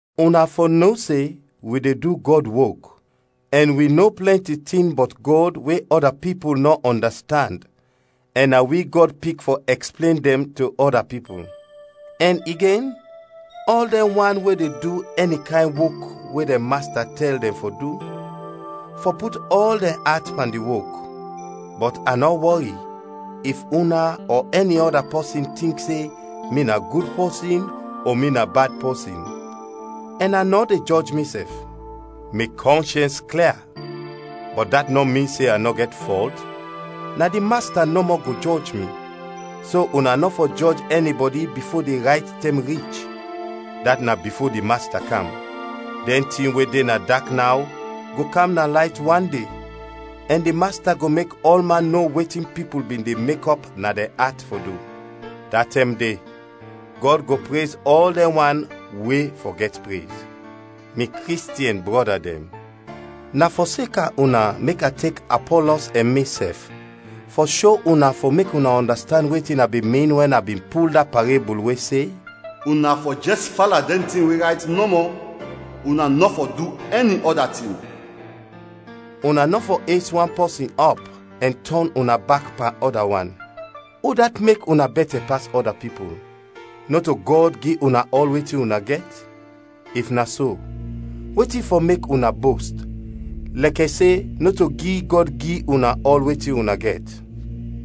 Una fɔ no se wi de du Gɔd wok, ɛn wi no plɛnti tin bɔt Gɔd we ɔda pipul nɔ ɔndastand ɛn na wi Gɔd pik fɔ ɛksplen dɛn to ɔda pipul. Ɛn igen, ɔl dɛn wan we de du ɛni kayn wok we dɛn masta tɛl dɛn fɔ du, fɔ put ɔl dɛn at pan di wok. Bɔt a nɔ wɔri if una ɔ ɛni ɔda pipul tink se mi na gud pɔsin ɔ mi na bad pɔsin, ɛn a nɔ de jɔj misɛf. Mi kɔnshɛns klia, bɔt dat nɔ min se a nɔ gɛt fɔlt. Na di Masta nɔmɔ go jɔj mi. So una nɔ fɔ jɔj ɛnibɔdi bifo di rayt tɛm rich, dat na bifo di Masta kam. Dɛn tin we de na dak naw go kam na layt wande ɛn di Masta go mek ɔlman no wetin pipul bin de mekɔp na dɛn at fɔ du. Da tɛm de Gɔd go prez ɔl dɛn wan we fɔ gɛt prez. Mi Kristiɛn brɔda dɛn, na fɔseka una mek a tek Apɔlɔs ɛn misɛf fɔ sho una fɔ mek una ɔndastand wetin a bin min wɛn a bin pul da parebul we se, “Una fɔ jɛs fala dɛn tin we rayt nɔmɔ, una nɔ fɔ du ɛni ɔda tin.” Una nɔ fɔ es wan pɔsin ɔp ɛn tɔn una bak pan ɔda wan. Udat mek una bɛtɛ pas ɔda pipul? Nɔto Gɔd gi una ɔl wetin una gɛt? If na so, wetin fɔ mek una bost, lɛkɛ se nɔto gi Gɔd gi una ɔl wetin una gɛt?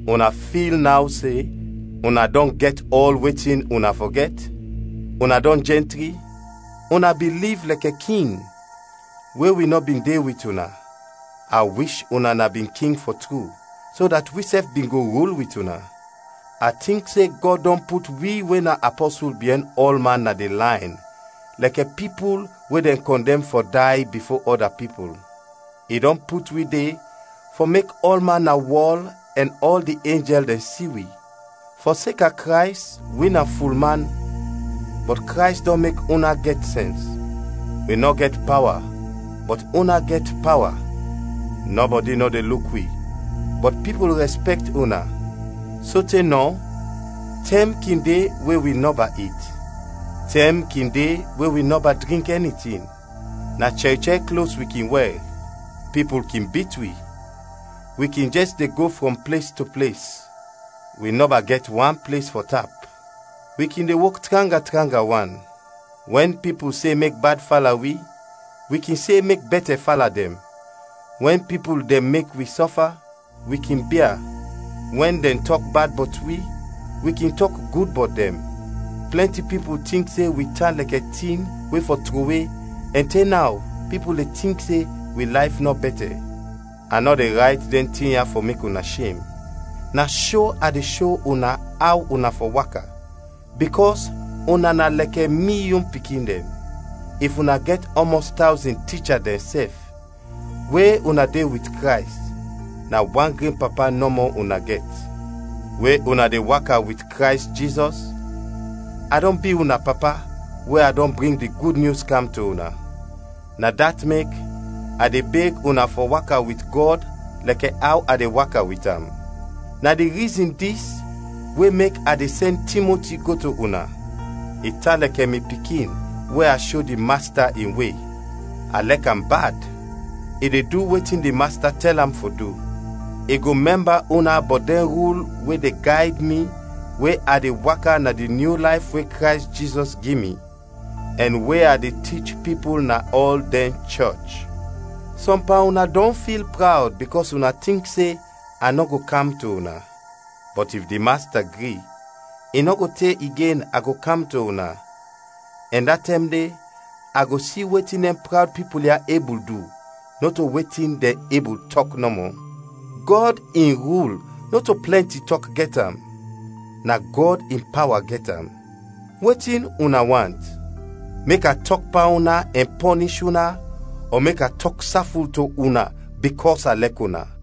Una fil naw se una dɔn gɛt ɔl wetin una fɔ gɛt? Una dɔn jɛntri? Una bin liv lɛkɛ king, we wi nɔ bin de wit una, a wish una na bin king fɔ tru, so dat wisɛf bin go rul wit una. A tink se Gɔd dɔn put wi we na apɔsul biɛn ɔlman na di layn lɛkɛ pipul we dɛn kɔndɛm fɔ day bifo ɔda pipul! I dɔn put wi de fɔ mek ɔlman na wɔl ɛn ɔl di enjɛl dɛn si wi. Fɔseka Krays wi na fulman, bɔt Krays dɔn mek una gɛt sɛns! Wi nɔ gɛt pawa, bɔt una gɛt pawa! Nɔbɔdi nɔ de luk wi, bɔt pipul rɛspɛkt una! Sote nɔ, tɛm kin de we wi nɔba it; tɛm kin de we wi nɔba drink ɛni tin; na chɛr chɛr klos wi kin wɛr; pipul kin bit wi; wi kin jɛs de go frɔm ples to ples, wi nɔba gɛt wan ples fɔ tap; wi kin de wok tranga tranga wan. Wɛn pipul se mek bad fala wi, wi kin se mek bɛtɛ fala dɛn; wɛn pipul dɛn mek wi sɔfa, wi kin bia; wɛn dɛn tɔk bad bɔt wi, wi kin tɔk gud bɔt dɛn; plɛnti pipul tink se wi tan lɛkɛ tin we fɔ trowe ɛn te naw pipul de tink se wi layf nɔ bɛtɛ! A nɔ de rayt dɛn tin ya fɔ mek una shem; na sho a de sho una aw una fɔ waka, bikɔs una na lɛkɛ mi yon pikin dɛn. If una gɛt ɔmɔs tawzin ticha dɛn sɛf, we una de wit Krays, na wan gren papa nɔmɔ una gɛt. We una de waka wit Krays Jizɔs, a dɔn bi una papa we a dɔn bring di Gud Nyus kam to una. Na dat mek, a de beg una fɔ waka wit Gɔd lɛkɛ aw a de waka wit am. Na di rizin dis we mek a de sɛn Timoti go to una. I tan lɛkɛ mi pikin we a sho di Masta in we; a lɛk am bad; i de du wetin di Masta tɛl am fɔ du. I go mɛmba una bɔt dɛn rul we de gayd mi we a de waka na di nyu layf we Krays Jizɔs gi mi, ɛn we a de tich pipul na ɔl dɛn chɔch. Sɔm pan una dɔn fil prawd bikɔs una tink se a nɔ go kam to una. Bɔt if di Masta gri, i nɔ go te igen a go kam to una, ɛn da tɛm de a go si wetin dɛn prawd pipul ya ebul du, nɔto wetin dɛn ebul tɔk nɔmɔ. Gɔd in rul nɔto plɛnti tɔk gɛt am, na Gɔd in pawa gɛt am. Wetin una want? Mek a tɔk pan una ɛn pɔnish una ɔ mek a tɔk saful to una bikɔs a lɛk una?